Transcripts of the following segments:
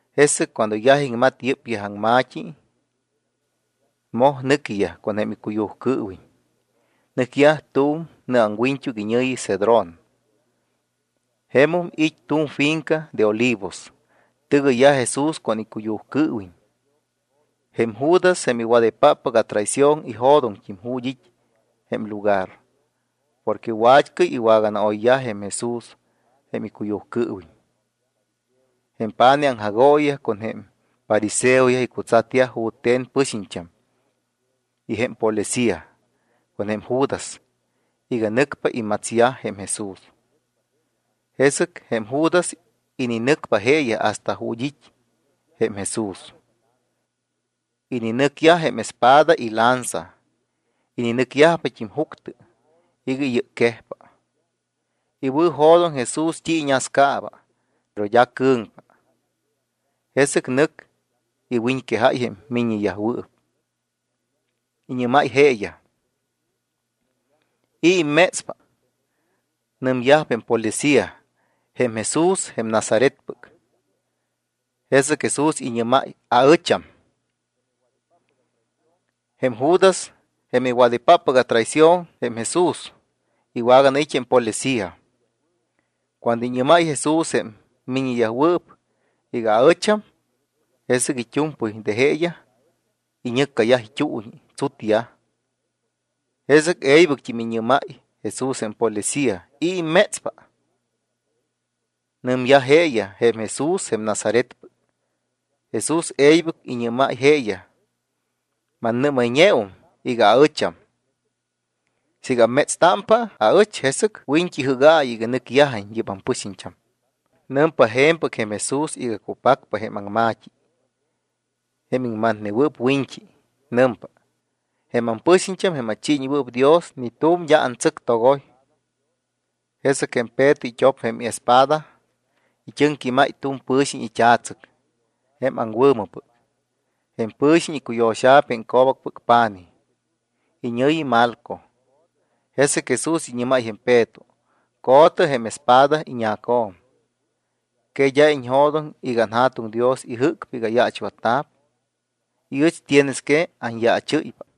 Jesɨc cuando yaj iŋmat yɨ́pyaj aŋma̱t́i, moj nɨquiyaj con jém icuyujcɨɨwiñ. Nɨcyaj tu̱m nɨ aŋwiñt́uc, iñɨ̱yi Cedrón. Jemum it́ tu̱m finca de olivos, tɨgɨyyaj Jesús con icuyujcɨɨwiñ. Jém Judas, jém iwadaypaap atraición, ijo̱doŋt́im ju̱t́ it́ jém lugar porque wa̱t́cɨy iwaganaoyyaj jém Jesús jém icuyujcɨɨwiñ. Jém pa̱nij aŋjagooyiyaj con jém fariseoyaj icutsatyaj jute̱n pɨxiñt́am y jém policía con jém Judas iga nɨcpa imatsyaj jém Jesús. Jesɨc jém Judas ininɨcpa jeeyaj hasta ju̱t́ it́ jém Jesús. Ininɨcyaj jém espada y lanza. Ininɨcyajpat́im juctɨ iga iyɨcquejpa. Iwɨ̱jo̱doŋ Jesús t́i iñascaaba, pero d́a cɨ̱ŋpa. Jesɨc nɨc iwiñquejáy jém miññeyajwɨɨp. Iñɨ́máy jeeyaj: —¿I̱ immétspa? Nɨmyajpa jém policía: —Jém Jesús, jém Nazaretpɨc. Jesɨc Jesús iñɨ́máy: —Aɨcham. Jém Judas, jém iwadaypaap atraición jém Jesús, iwaganait́ jém policía. Cuando iñɨ́máy Jesús jém miññeyajwɨɨp iga: “Aɨcham”, jesɨc it́u̱mpɨy de jeeyaj iñɨccayaj it́uuñi, tsutyaj. Jesɨc e̱ybɨct́im iñɨ́máy Jesús jém policía: —¿I̱ immétspa? Nɨmyajpa jeeyaj: —Jém Jesús, jém Nazaretpɨc. Jesús e̱ybɨc iñɨ́máy jeeyaj: —Mannɨ́mayñeum iga aɨcham. Siiga ammétstámpa aɨch, jesɨc wiñt́i jɨ́gaayɨ iga nɨcyajiñ yɨ́p ampɨxiñt́am. Nɨmpa je̱mpɨc jém Jesús iga cupacpa jém aŋma̱t́i jém iŋmatnewɨɨp wiñt́i. Nɨmpa: “Jém ampɨxiñt́am, jém achiiñewɨɨp Dios, ni tu̱m d́a antsɨctogoy.” Jesɨc jém Peto it́op jém espada, it́ɨŋquímáy tu̱m pɨ̱xiñ it́a̱tsɨc jém aŋwɨ̱mɨpɨc. Jém pɨ̱xiñ icuyo̱xa̱p jém co̱bacpɨc pa̱nij, iñɨ̱yi Malco. Jesɨc Jesús iñɨ́máy jém Peto: —Co̱tɨ jém espada iñacjo̱m. ¿Que d́a iñjo̱doŋ iga anJa̱tuŋ Dios ijɨ́cpa iga ayaachwatta̱p y ɨch tienes que anyaachɨ́ypa?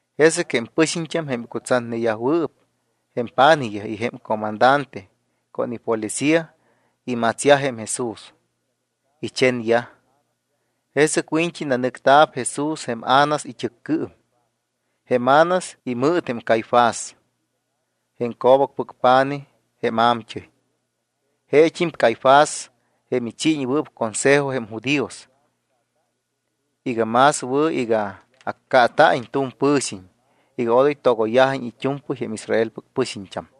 Jesɨc jém pɨxiñt́am jém icutsatneyajwɨɨp jém pa̱nijyaj y jém comandante con ipolicía imatsyaj jém Jesús. Ichenyaj. Jesɨc wiñt́i nanɨcta̱p Jesús jém Anás it́ɨccɨɨm, jém Anás imɨɨt jém Caifás, jém co̱bacpɨc pa̱nij jém a̱mt́ɨy. Jeet́im Caifás, jém ichiiñewɨɨp consejo jém judíos, iga más wɨ̱ iga accaata̱iñ tu̱m pɨ̱xiñ iga odoy togoyyajiñ it́u̱mpɨy jém Israelpɨc pɨxiñt́am.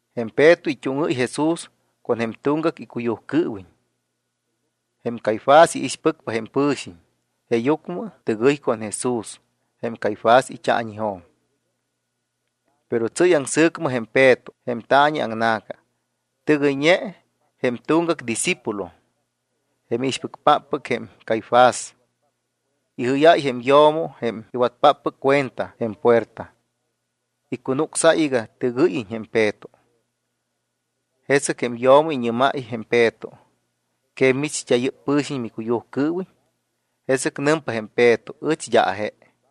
Jém Peto it́úŋɨ́y Jesús con jém tuŋgac icuyujcɨɨwiñ. Jém Caifás iixpɨcpa jém pɨ̱xiñ, jeeyucmɨ tɨgɨy con Jesús jém Caifás it́aañijo̱m. Pero tsɨ́y aŋsɨ̱cmɨ jém Peto jém taañi aŋna̱ca. Tɨgɨyñe jém tuŋgac discípulo, jém iixpɨcpáppɨc jém Caifás, ijɨ́yáy jém yo̱mo jém iwatpáppɨc cuenta jém puerta. Icunucsáy iga tɨgɨ́yiñ jém Peto. Jesɨc jém yo̱mo iñɨ́máypa jém Peto: —¿Que mimich, d́a yɨ́p pɨ̱xiñ micuyujcɨɨwiñ? Jesɨc nɨmpa jém Peto: —Ɨch d́a aje.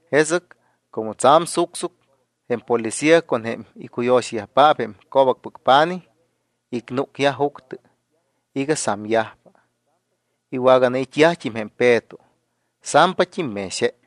Jesɨc como tsa̱m sucsuc, jém policía con jém icuyo̱xayajpaap jém co̱bacpɨc pa̱nij, icnúcyaj juctɨ iga samyajpa. Iwaganait́yajt́im jém Peto. Sampat́im mex je.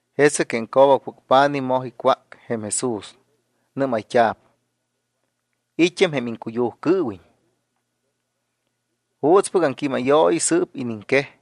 Jesɨc jém co̱bacpɨc pa̱nij moj icwác jém Jesús. Nɨ́mayt́a̱p: —¿I̱t́am jém iŋcuyujcɨɨwiñ? ¿Juutspɨc aŋquímayooyi sɨ́p iniŋquej?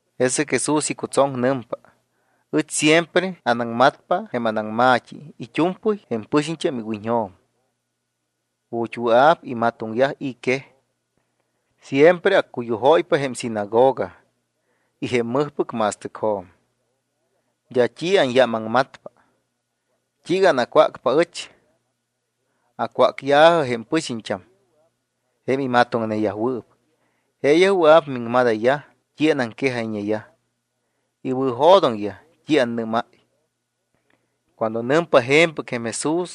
Jesɨc Jesús icutsoŋ. Nɨmpa: —Ɨch siempre anaŋmatpa jém anaŋma̱t́i it́u̱mpɨy jém pɨxiñt́am iwiñjo̱m ju̱t́ wɨa̱p imatoŋyaj i̱ quej. Siempre accuyujóypa jém sinagoga y jém mɨjpɨc ma̱stɨcjo̱m. D́a t́i anyámaŋmatpa. ¿T́iiga anacwácpa aɨch? Acwácya̱jɨ jém pɨxiñt́am jém amatoŋneyajwɨɨp. Jeeyaj wɨa̱p miŋmadayyaj t́i anaŋquejayñeyaj. Iwɨ̱jo̱doŋyaj t́i annɨ́máy. Cuando nɨmpa je̱mpɨc jém Jesús,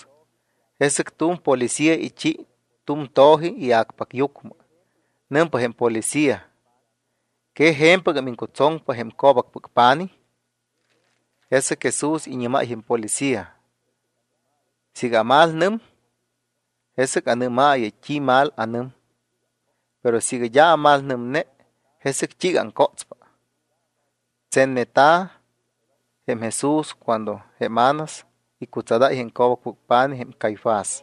jesɨc tu̱m policía ichi tu̱m to̱ji ia̱cpacyucmɨ. Nɨmpa jém policía: —¿Que je̱mpɨgam iŋcutsoŋpa jém co̱bacpɨc pa̱nij? Jesɨc Jesús iñɨ́máy jém policía: —Siiga amalnɨm, jesɨc anɨ́maayɨ t́i mal anɨm. Pero siiga d́a amalnɨmne, ¿jesɨc t́iiga aŋcótspa? Tsenneta̱ jém Jesús cuando jém Anás icutsadáy jém co̱bacpɨc pa̱nij, jém Caifás.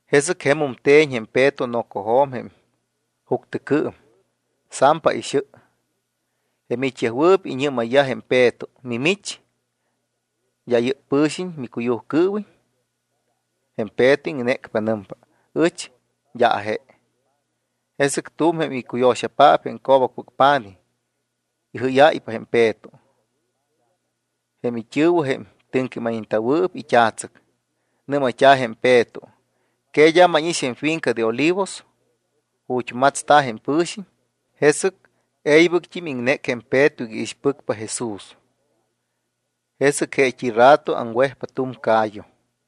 Jesɨc jemum te̱ñ jém Peto nocojo̱m jém juctɨcɨɨm. Sampa ixɨ. Jém it́yajwɨɨp iñɨ́mayyaj jém Peto: —Mimich, ¿d́a yɨ́p pɨ̱xiñ micuyujcɨɨwiñ? Jém Peto iŋnécpa. Nɨmpa: —Ɨch d́a aje. Jesɨc tu̱m jém icuyo̱xapaap jém co̱bacpɨc pa̱nij ijɨ́yáypa jém Peto. Jém it́ɨ̱wɨ, jém it́ɨŋquímayñewɨɨp it́a̱tsɨc. Nɨ́mayt́a̱ jém Peto: —¿Que d́a mánix jém finca de olivos, ju̱t́ matsta̱ jém pɨ̱xiñ? Jesɨc e̱ybɨct́im iŋnéc jém Peto iga iixpɨcpa Jesús. Jesɨc jeet́im rato aŋwejpa tu̱m ca̱yu.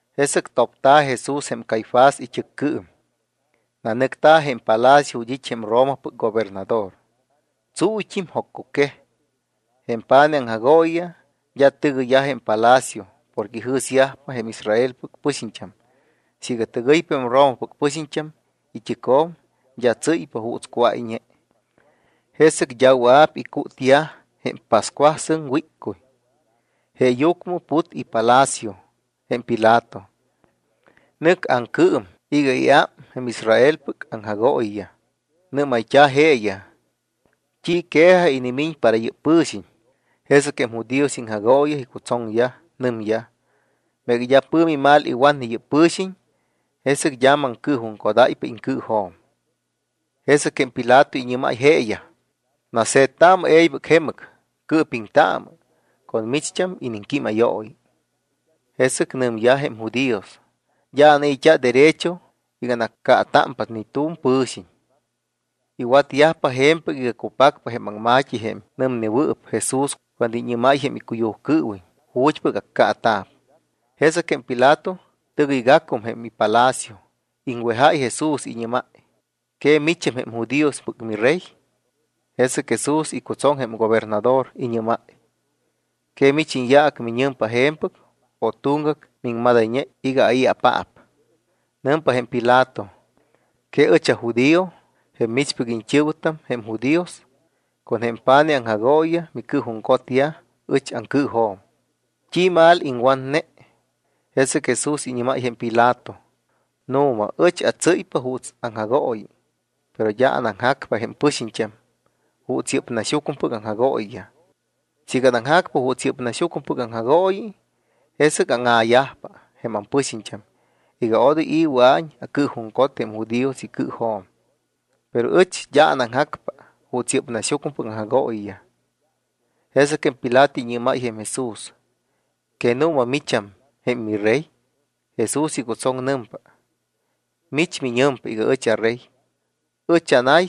Jesɨc topta̱ Jesús jém Caifás it́ɨccɨɨm. Nanɨcta̱ jém palacio ju̱t́ it́ jém Romapɨc gobernador. Tsuuyt́im. Joccuquej. Jém pa̱nij aŋjagooyiyaj d́a tɨgɨyyaj jém palacio porque ijɨ̱syajpa jém Israelpɨc pɨxiñt́am siiga tɨgɨypa jém Romapɨc pɨxiñt́am it́ɨcjo̱m, d́a tsɨ́y juuts cuáyñe, jesɨc d́a wɨa̱p icútyaj jém pascuasɨŋ wíccuy. Jeeyucmɨ put ipalacio jém Pilato, nɨc aŋcɨɨm iga iám jém Israelpɨc aŋjagooyiyaj. Nɨ́mayt́a̱ jeeyaj: —¿T́i quejaj inimiñ para yɨ́p pɨ̱xiñ? Jesɨc jém judíos iŋjagooyiyaj icutsoŋyaj, nɨmyaj: —Meega d́a pɨ̱mi mal iwatne yɨ́p pɨ̱xiñ, jesɨc d́a maŋcɨɨjuŋcodáypa iŋcɨɨjo̱m. Jesɨc jém Pilato iñɨ́máy jeeyaj: —Nase̱ttaamɨ e̱ybɨc jemɨc, cɨɨpiŋtaamɨ con micht́am iniŋquímayooyi. Jesɨc nɨmyajpa jém judíos: —D́a anai̱t́a derecho iga anaccaatámpa ni tu̱m pɨ̱xiñ. Iwatyajpa je̱mpɨc iga cupacpa jém aŋma̱t́i jém nɨmnewɨɨp Jesús cuando iñɨ́máy jém icuyujcɨɨwiñ ju̱t́pɨc accaata̱p. Jesɨc jém Pilato tɨgɨygacum jém palacio. Iŋwejáy Jesús, iñɨ́máy: —¿Que micham jém judíospɨc miRey? Jesɨc Jesús icutsoŋ jém gobernador, iñɨ́máy: —¿Que mich iñyaac miñɨmpa je̱mpɨc o tuŋgac miŋmadayñe iga ai̱apaap? Nɨmpa jém Pilato: —¿Que ɨch ajudío? Jém michpɨc iñt́ɨ̱wɨtam, jém judíos, con jém pa̱nij aŋjagooyiyaj micɨɨjuŋcotyaj ɨch aŋcɨɨjo̱m. ¿T́i mal iŋwatne? Jesɨc Jesús iñɨ́máy jém Pilato: —Nu̱ma ɨch atsɨ́ypa juuts aŋjagooyi, pero d́a anaŋjacpa jém pɨxiñt́am juuts yɨ́p naxyucmɨpɨc aŋjagooyiyaj. Siiga anaŋjacpa juuts yɨ́p naxyucmɨpɨc aŋjagooyi, jesɨc áŋa̱yajpa jém ampɨxiñt́am iga odoy i̱ wɨa̱iñ acɨɨjuŋcot jém judíos icɨɨjo̱m. Pero ɨch d́a anaŋjacpa juuts yɨ́p naxyucmɨpɨc aŋjagooyiyaj. Jesɨc jém Pilato iñɨ́máy jém Jesús: —¿Que nu̱ma micham jém miRey? Jesús icutsoŋ. Nɨmpa: —Mich miñɨmpa iga ɨch aRey. Ɨch anay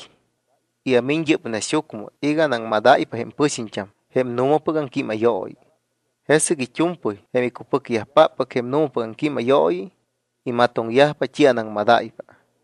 y amiñ yɨ́p naxyucmɨ iga anaŋmadáypa jém pɨxiñt́am jém nu̱mapɨc aŋquímayooyi. Jesɨc it́u̱mpɨy jém icupɨcyajpáppɨc jém nu̱mapɨc aŋquímayooyi, imatoŋyajpa t́i anaŋmadáypa.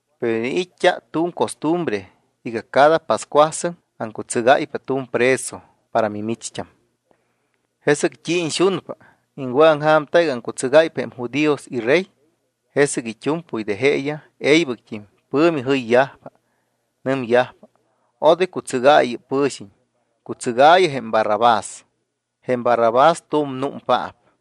Pero iniit́t́a tu̱m costumbre iga cada pascuasɨŋ aŋcutsɨgáypa tu̱m preso para mimicht́am. ¿Jesɨc t́i iñxunpa, iŋwɨ̱aŋja̱mta iga aŋcutsɨgáypa jém judíos iRey? Jesɨc it́u̱mpɨy de jeeyaj e̱ybɨct́im pɨ̱mi jɨyyajpa. Nɨmyajpa: —Odoy cutsɨgaayɨ yɨ́p pɨ̱xiñ. Cutsɨgaayɨ jém Barrabás. Jém Barrabás tu̱m númpaap.